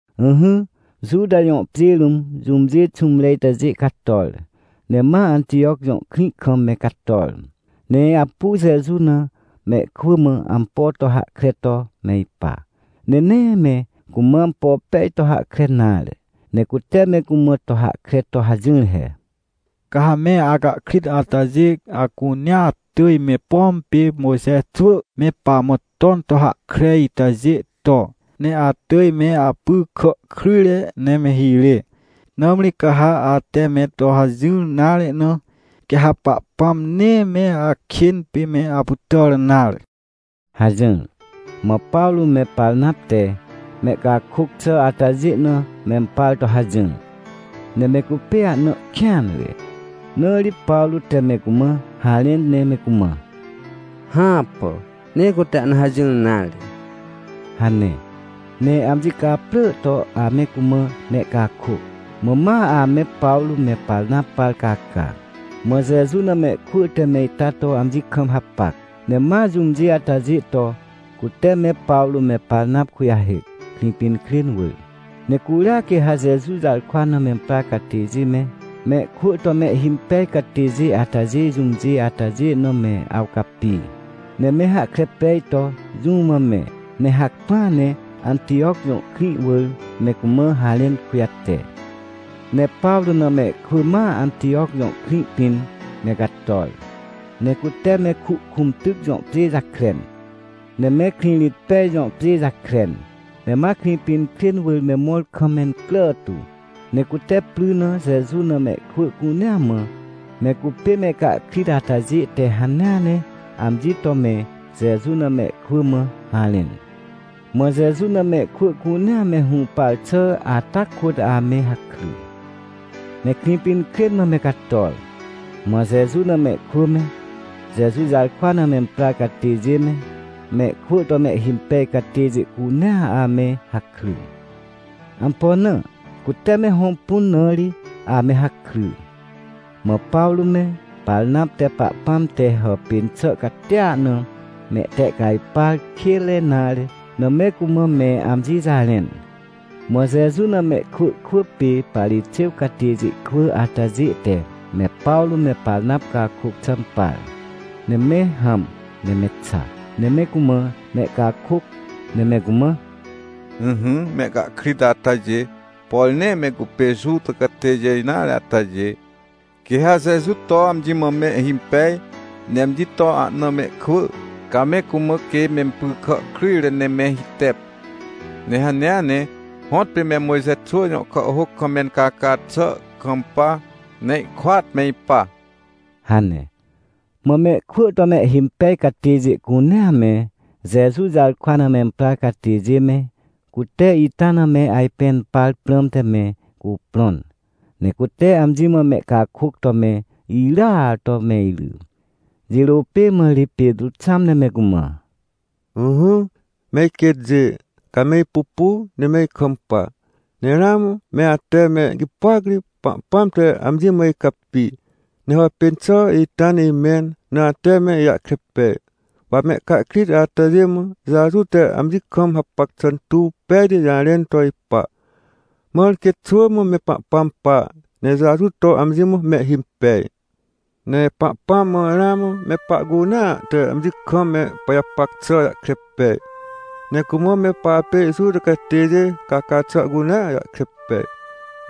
Ỹhỹ, Juta jõ pjê rũm, jũmjê xũmre itajê cator, ne ma Antijoc jõ krĩ kam me cator. Ne apu Jeju na mehkwỳ mã ampo to hahkre to me ipa, ne nee me cumã ampo pej to hahkre nare. Ne cute me cumã to hahkre to hajỹr he: — Ca ha me acahkrit atajê acunea atỳj me, pom pê Mojxe xwỳ me pamã ton to hahkre itajê to, ne atỳj me apy kà kryjre ne me hirê. Nãmri ca ha ate me to hajỹr nare na, quê ha Pahpãm nee me akên pê me apytàr nare — hajỹr. Mã Pawrô me Parnap te mehcakôc xà atajê na mempar to hajỹr. Ne me cupê ahna ihkêanre. Na ri Pawrô te me cumã harẽn, ne me cumã: — Hãpà! Nee cute ahna hajỹr nare — hane. Ne amji caprỳ to ame cumã mehcakôc. Mã ma ame Pawrô me Parnap par caca. Mã Jeju na mehkwỳ te me ita to amji kam hapac, ne ma jũmjê atajê to, cute me Pawrô me Parnap kujahêc, Krĩpinkrên wỳr. Ne curia quê ha Jeju jarkwa na memprar catêjê me, mehkwỳ to mehhimpej catêjê atajê jũmjê atajê na me awcapi, ne me hahkre pej to jũ mã me, ne hacpỹa ne Antijoc jõ krĩ wỳr me cumã harẽn kujate. Ne Pawrô na mehkwỳ ma Antijoc jõ krĩ pĩn me cator, ne cute me Kuhkũmtyc jõ pjê jakren, ne me Krĩrĩtpej jõ pjê jakren, ne ma Krĩpinkrên wỳr me mõr kam mencrà tu. Ne cute pry na Jeju na mehkwỳ cunea mã, me cupê mehcahkrit atajê te hanea ne amji to me Jeju na mehkwỳ mã harẽn. Mã Jeju na mehkwỳ cunea me hũpar xà ata kôt ame hakry. Ne Krĩpinkrên mã me cator, mã Jeju na mehkwỳ me, Jeju jarkwa na memprar catêjê me, mehkwỳ to mehhimpej catêjê cunea ame hakry. Ampo na? Cute me hõmpun na ri ame hakry. Mã Pawrô me, Parnap te Pahpãm te hàpên xà catia na mehtehcajpar kênre nare na me cumã me amji jarẽn. Mã Jeju na mehkwỳ kwỳ pê Parixêw catêjê kwỳ atajê te me Pawrô me Parnap cakôc xà impar, ne me hãm ne me xa, ne me cumã mehcakôc, ne me cumã: — Ỹhỹ, mehcahkrit atajê, por nee me cupê Juta catêjê nare atajê, quê ha Jeju to amji mã mehhimpej ne amji to ahna mehkwỳ, ca me cumã, quê mempy kà kryjre ne me hitep. Ne hanea ne, hõtpê me Mojxe xwỳ jõ kàhhôc kam mencaca xà kampa, ne ihkôat me ipa — hane. Mã mehkwỳ to mehhimpej catêjê cunea me, Jeju jarkwa na memprar catêjê me, cute ita na me ajpẽn par prãmte me cuprõn. Ne cute amji mã mehcakôc to me irya to me iry, jirô pê mã ri Petrô xãm ne me cumã: — Ỹhỹ, me iquêtjê, ca me ipupu ne me ikampa, ne ramã me ate me gipôac ri Pahpãm te amji mã icapi, ne hàpên xà ita na imẽn na ate me ijahkre pej. Wa mehcahkrit atajê mã Jeju te amji kam hapac xà tuw pejti jarẽn to ipa. Mãr quê xwỳ mã me Pahpãm pa, ne Jeju to amji mã mehhimpej. Ne Pahpãm mã ramã me pahcunea te amji kam me pajapac xà jahkre pej, ne cumã me papê Juta catêjê caca xà cunea jahkre pej.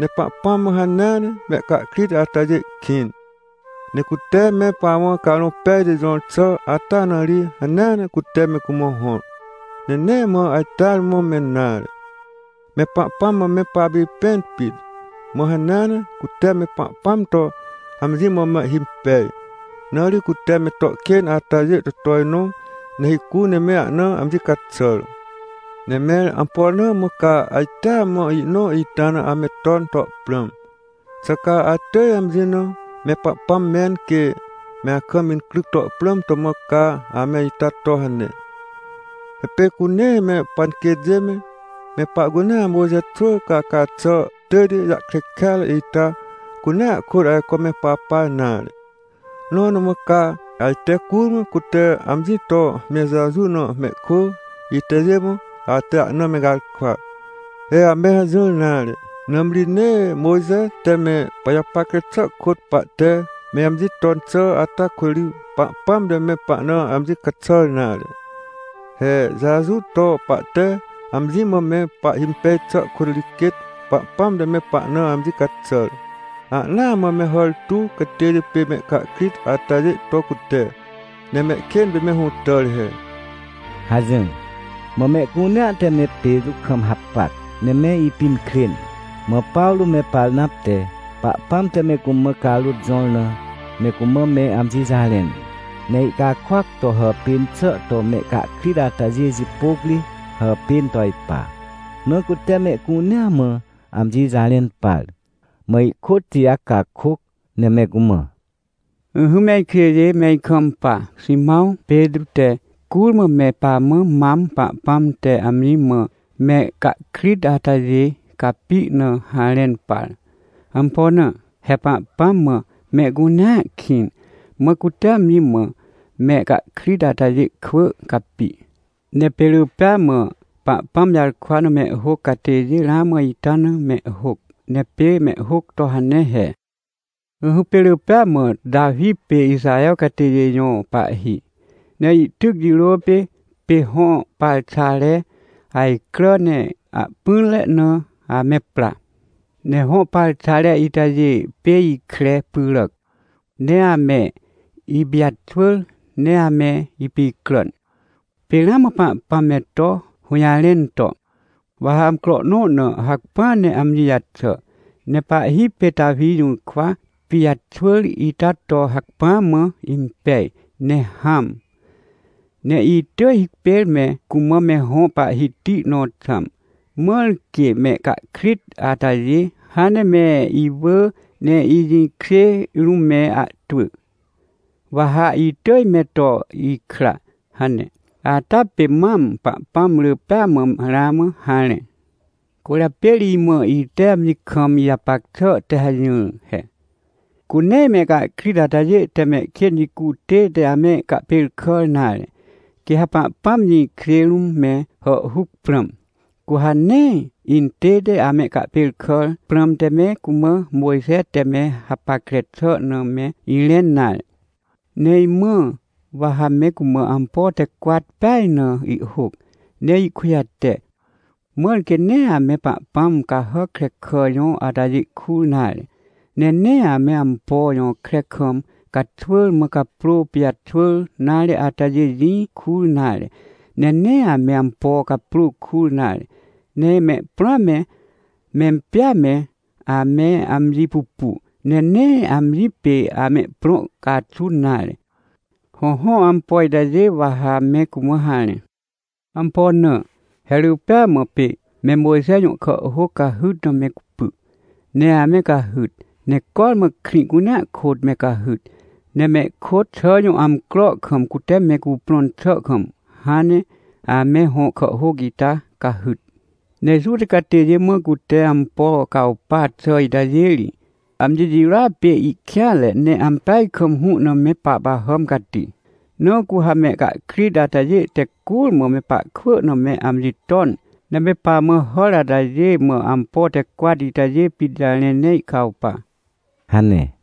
Ne Pahpãm mã hanea ne mehcahkrit atajê kĩn. Ne cute me pamã Carõ Pejti jõr xà ata na ri hanea ne cute me cumã hõr. Ne nee mã ajteare mã me nare, me Pahpãm mã me papipẽn pit. Mã hanea ne cute me Pahpãm to amji mã mehhimpej, na ri cute me to kên atajê to tojnõ ne hicu ne me ahna amji caxàr. — Ne mẽr ampo na mã ca ajtea mã ihnõ ita na ame ton to prãm? Xà ca atỳj amji na me Pahpãm mẽn, quê me akam incryc to prãm to mã ca ame ita to hane? He pê cu nee me panquêtjê me, me pahcunea Mojxe xwỳ caca xà tỳjti jahkre kêatre ita cunea kôt ajco me papa nare. Nõ na mã ca ajte curmã cute amji to me Jeju na mehkwỳ itajê mã ate ahna me garkwa? He ame hajỹr nare. Nãmri nee Mojxe te me pajapackre xà kôt pahte me amji ton xà ata kôt ri Pahpãm te me pahna amji caxàr nare. He Jeju to pahte amji mã me pahhimpej xà kôt ri quêt Pahpãm te me pahna amji caxàr. Ahnaa mã me hàr tuw catêjê pê mehcahkrit atajê to cute, ne mehkên pê me hũtàr he — hajỹr. Mã mehcunea te me Petrô kam hapac, ne me ipinkrên. Mã Pawrô me Parnap te, Pahpãm te me cumã carôt jõr na me cumã me amji jarẽn, ne ihcakôac to hàpên xà to mehcahkrit atajê jipôc ri hàpên to ipa. Na cute mehcunea mã amji jarẽn par. Mã ihkôt Tijac cakôc, ne me cumã: — Ỹhỹ, me ikjêjê, me ikampa. Ximãw Petrô te curmã me pamã mam Pahpãm te amji mã mehcahkrit atajê capi na harẽn par. Ampo na? He Pahpãm mã mehcunea kĩn. Mã cute amji mã mehcahkrit atajê kwỳ capi. Ne pê rỳ pêa mã Pahpãm jarkwa na mehhôc catêjê ramã ita na mehhôc. Ne pê mehhôc to hane he: “Ỹhỹ, pê rỳ pêa mã Tawi pê Ixaher catêjê jõ pahhi. Ne ihtyc jirô pê, pê hõ parxare ajcrà ne ahpỹnre na ame pra. Ne hõ parxare itajê pê ikre pyràac. Ne ame ipijaxwỳr ne ame ipicràn. Pê ramã Pahpãm me to hũjarẽn to: ‘Wa ha amcro nõ na hacpỹa ne amji jaxà, ne pahhi pê Tawi jũrkwa pijaxwỳr ita to hacpỹa mã impej ne hãm. Ne itỳj hipêr me cumã me hõ Pahhiti nõ xãm. Mãr quê mehcahkrit atajê hãn ne me iwỳ, ne ijĩkjê rũm me ahtwỳ, wa ha itỳj me to ikra’ hane. Ata pê mam Pahpãm rỳ pêa mã ramã harẽ”. — Cwỳrjapê ri imã ite amji kam ijapac xà te hajỹr he. Cu nee mehcahkrit atajê te mehkên jicu tête amehcahpêrkàr nare, quê ha Pahpãm jĩkjê rũm me hàhhuc prãm, cu ha nee intête amehcahpêrkàr prãmte me cumã Mojxe te me hapackre xà na me irẽn nare. Ne imãa, wa ha me cumã ampo te cwat peaj na ihhôc, ne ihkujate. Mãr quê nee ame pahpãm cahàc krekà jõ atajê kur nare. Ne nee ame ampo jõkre kam caxwỳr mã caprô pijaxwỳr nare atajê jĩ kur nare. Ne nee ame ampo caprô kur nare. Ne mehprõa me, mempjêa me, ame amji pupu, ne nee amji pê amehprõ caxun nare. Hõhõ, ampo itajê wa ha me cumã harẽ. Ampo na? He rỳ pêa mã pê me Mojxe jõ kàhhôc cahyt na me cupy, ne ame cahyt, ne cormã krĩ cunea kôt me cahyt. Ne mehkôt xà jõ amcro kam, cute me cuprõn xà kam, hãn ne ame hõ kàhhôc ita cahyt. Ne Juta catêjê mã cute ampo cawpa xà itajê ri, amji jirôa pê ihkêanre, ne ampeaj kam hũ na me pahpahàm cati. Na cu ha mehcahkrit atajê te curmã me pahkwỳ na me amji ton, ne me pamã hàr atajê mã ampo te cwat itajê pit jarẽ ne ihcawpa — hane.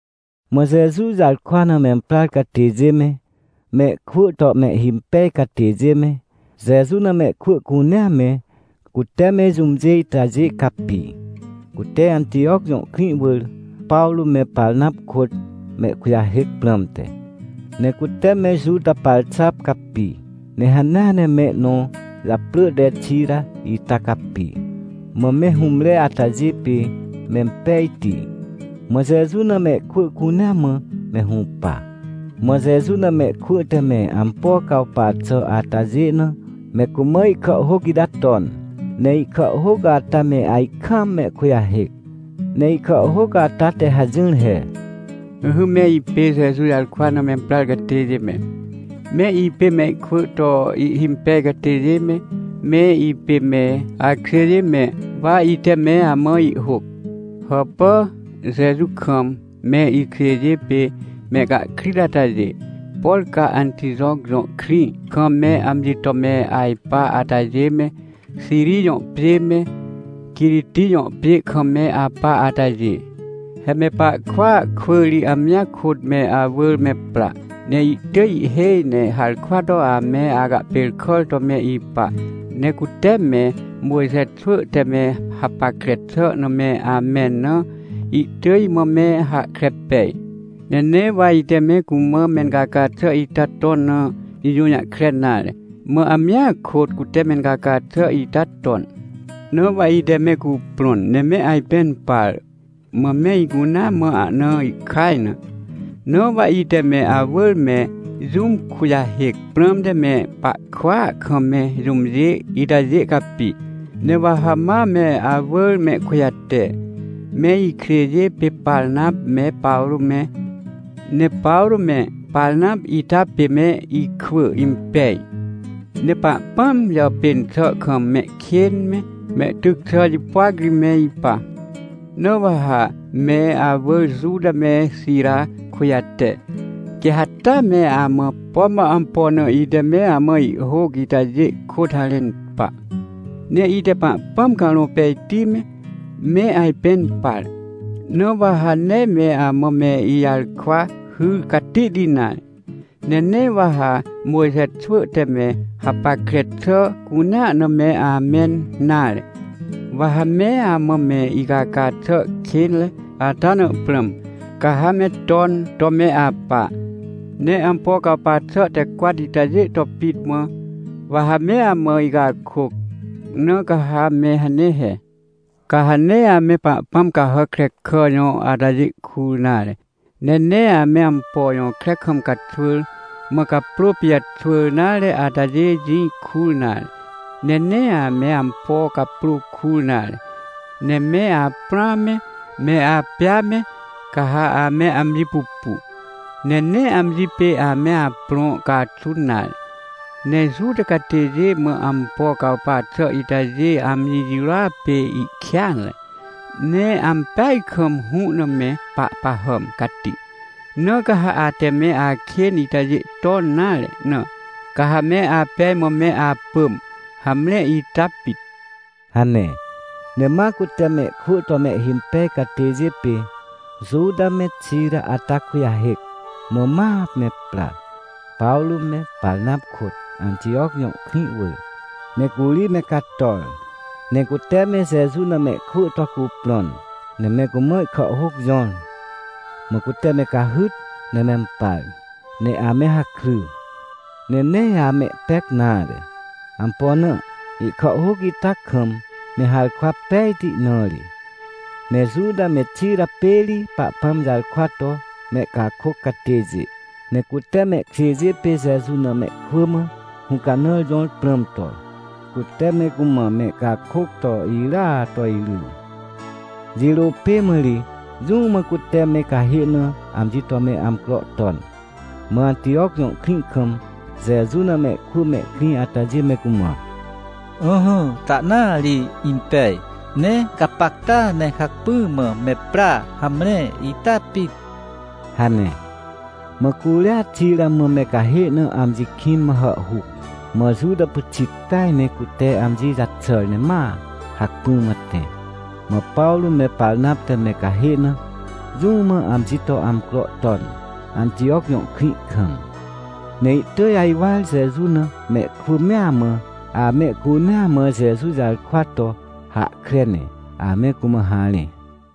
Mã Jeju jarkwa na memprar catêjê me, mehkwỳ to mehhimpej catêjê me, Jeju na mehkwỳ cunea me, cute me jũmjê itajê capi, cute Antijoc jõ krĩ wỳr Pawrô me Parnap kôt mehkujahêc prãmte. Ne cute me Juta Parxap capi, ne hanea ne mehnõ japrỳ te Xira ita capi. Mã me hũmre atajê pê mempejti, mã Jeju na mehkwỳ cunea mã me hũpa. Mã Jeju na mehkwỳ te me ampo cawpa xà atajê na me cumã ihkàhhôc ita ton, ne ihkàhhôc ata me ajkaam mehkujahêc. Ne ihkàhhôc ata te hajỹr he: “Ỹhỹ, me ipê Jeju jarkwa na memprar catêjê me, me ipê mehkwỳ to ihhimpej catêjê me, me ipê me akjêjê me, wa ite me amã ihhôc. Hàpà, Jeju kam me ikjêjê pê mehcahkrit atajê, por ca Antijoc jõ krĩ kam me amji to me ajpa atajê me, Xiri jõ pjê me, Quiriti jõ pjê kam me apa atajê. He me pahkwỳa kwỳ ri amjia kôt me awỳr me pra, ne ihtỳj ihhêj ne harkwa to ame acahpêrkàr to me ipa, ne cute me Mojxe xwỳ te me hapackre xà na me amẽn na, ihtỳj imã me hahkre pej. Ne nee wa ite me cumã mencaca xà ita ton na ijũjahkre nare, mã amjia kôt cute mencaca xà ita ton. Na wa ite me cuprõn, ne me ajpẽn par, mã me icunea mã ahna ihkaj na. Na wa ite me awỳr me jũm kujahêc prãmte me pahkwỳa kam me jũmjê itajê capi, ne wa ha ma me awỳr mehkujate, me ikjêjê pê Parnap me Pawrô me. Ne Pawrô me Parnap ita pê me ikwỳ impeaj. Ne Pahpãm jàpên xàa kam mehkên me, mehtyc xà jipôac ri me ipa. Na wa ha me awỳr Juta me Xira kujate, quê ha taa me amã, pom wa ampo na ite me amã ihhôc itajê kôt harẽn pa. Ne ite Pahpãm Carõ Pejti me, me ajpẽn par. Na wa ha nee me amã me ijarkwa hyr catihti nare. Ne nee wa ha Mojxe xwỳ te me hapackre xà cunea na me amẽn nare. Wa ha me amã me icaca xà kênre ata na prãm, ca ha me ton to me apa. Ne ampo cawpa xà te cwat itajê to pit mã wa ha me amã icakôc. Na ca ha me hane he. Ca ha nee ame pahpãm cahàc krekà jõ atajê kur nare, ne nee ame ampo jõkre kam caxwỳr, mã caprô pijaxwỳr nare atajê jĩ kur nare, ne nee ame ampo caprô kur nare. Ne me aprõa me, me apjêa me, ca ha ame amji pupu, ne nee amji pê ame aprõ caxun nare. Ne Juta catêjê mã ampo cawpa xà itajê amji jirôa pê ihkêanre, ne ampeaj kam hũ na me pahpahàm cati. Na ca ha ate me akên itajê ton nare na, ca ha me apej mã me apỳm. Hamre, ita pit” hane. Ne ma cute mehkwỳ to mehhimpej catêjê pê Juta me Xira ata kujahêc, mã ma me pra, Pawrô me Parnap kôt, Antijoc jõ krĩ wỳr, ne curi me cator. Ne cute me Jeju na mehkwỳ to cuprõn, ne me cumã ihkàhhôc jõr. Mã cute me cahyt, ne mempar, ne ame hakry, ne nee amehpec nare. Ampo na? Ihkàhhôc ita kam me harkwa pejti na ri. Ne Juta me Xira pê ri Pahpãm jarkwa to mehcakôc catêjê, ne cute mehkjêjê pê Jeju na mehkwỳ mã hũcanãr jõr prãm to, cute me cumã mehcakôc to irya to iry. Jirô pê mã ri jũ mã cute me cahê na amji to me amcro ton. Mã Antijoc jõ krĩ kam Jeju na mehkwỳ mehkrĩ atajê me cumã: — Ỹhỹ, tahnaa ri impej. Ne gapacta ne hacpỹ mã me pra, hamre, ita pit — hane. Mã curia Xira mã me cahê na amji kĩn mã hàhhuc, mã Juta pyxit peaj ne cute amji jaxàr ne ma hacpỹ mã tẽ. Mã Pawrô me Parnap te me cahê na, jũ mã amji to amcro ton, Antijoc jõ krĩ kam. Ne ihtỳj ajwar Jeju na mehkwỳ mea mã, amehcunea mã Jeju jarkwa to hahkre ne ame cumã harẽ.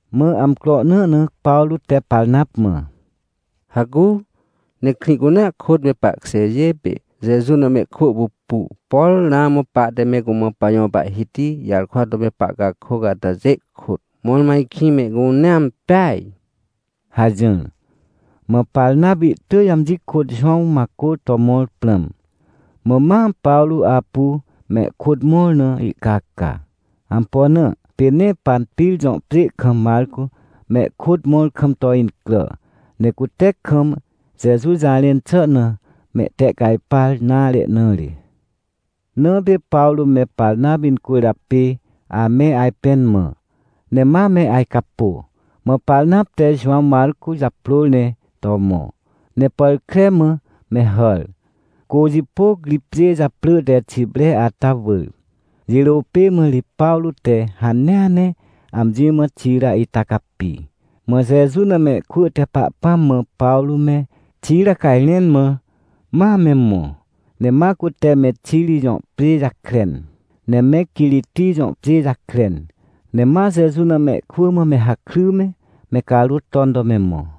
Mã amcro nõ na Pawrô te Parnap mã: — Hacu, ne krĩ cunea kôt, me pahkjêjê pê Jeju na mehkwỳ pupu, por ramã pahte me cumã pajõ Pahhiti jarkwa to me pahcakôc atajê kôt, mõrmõ ajkĩ mehcunea impeaj — hajỹr. Mã Parnap ihtỳj amji kôt Jowãw Macô to mõr prãm. Mã ma Pawrô apu mehkôt mõr na ihcaca. Ampo na? Pê nee Panpir jõ pjê kam Macô mehkôt mõr kam to incrà, ne cute kam Jeju jarẽn xà na mehtehcajpar nare na ri. Na pê Pawrô me Parnap incwỳrjapê ame ajpẽn mã, ne ma me ajcapô. Mã Parnap te Jowãw Macô japrôr ne to mõ, ne pàr kre mã me hàr, cô jipôc ri pjê japrỳ te Xipre ata wỳr. Jirô pê mã ri Pawrô te hanea ne amji mã Xira ita capi, mã Jeju na mehkwỳ te Pahpãm mã Pawrô me Xira cajrẽn mã ma me mõ. Ne ma cute me Xiri jõ pjê jakren, ne me Quiriti jõ pjê jakren, ne ma Jeju na mehkwỳ mã me hakry me, me carôt ton to me mõ.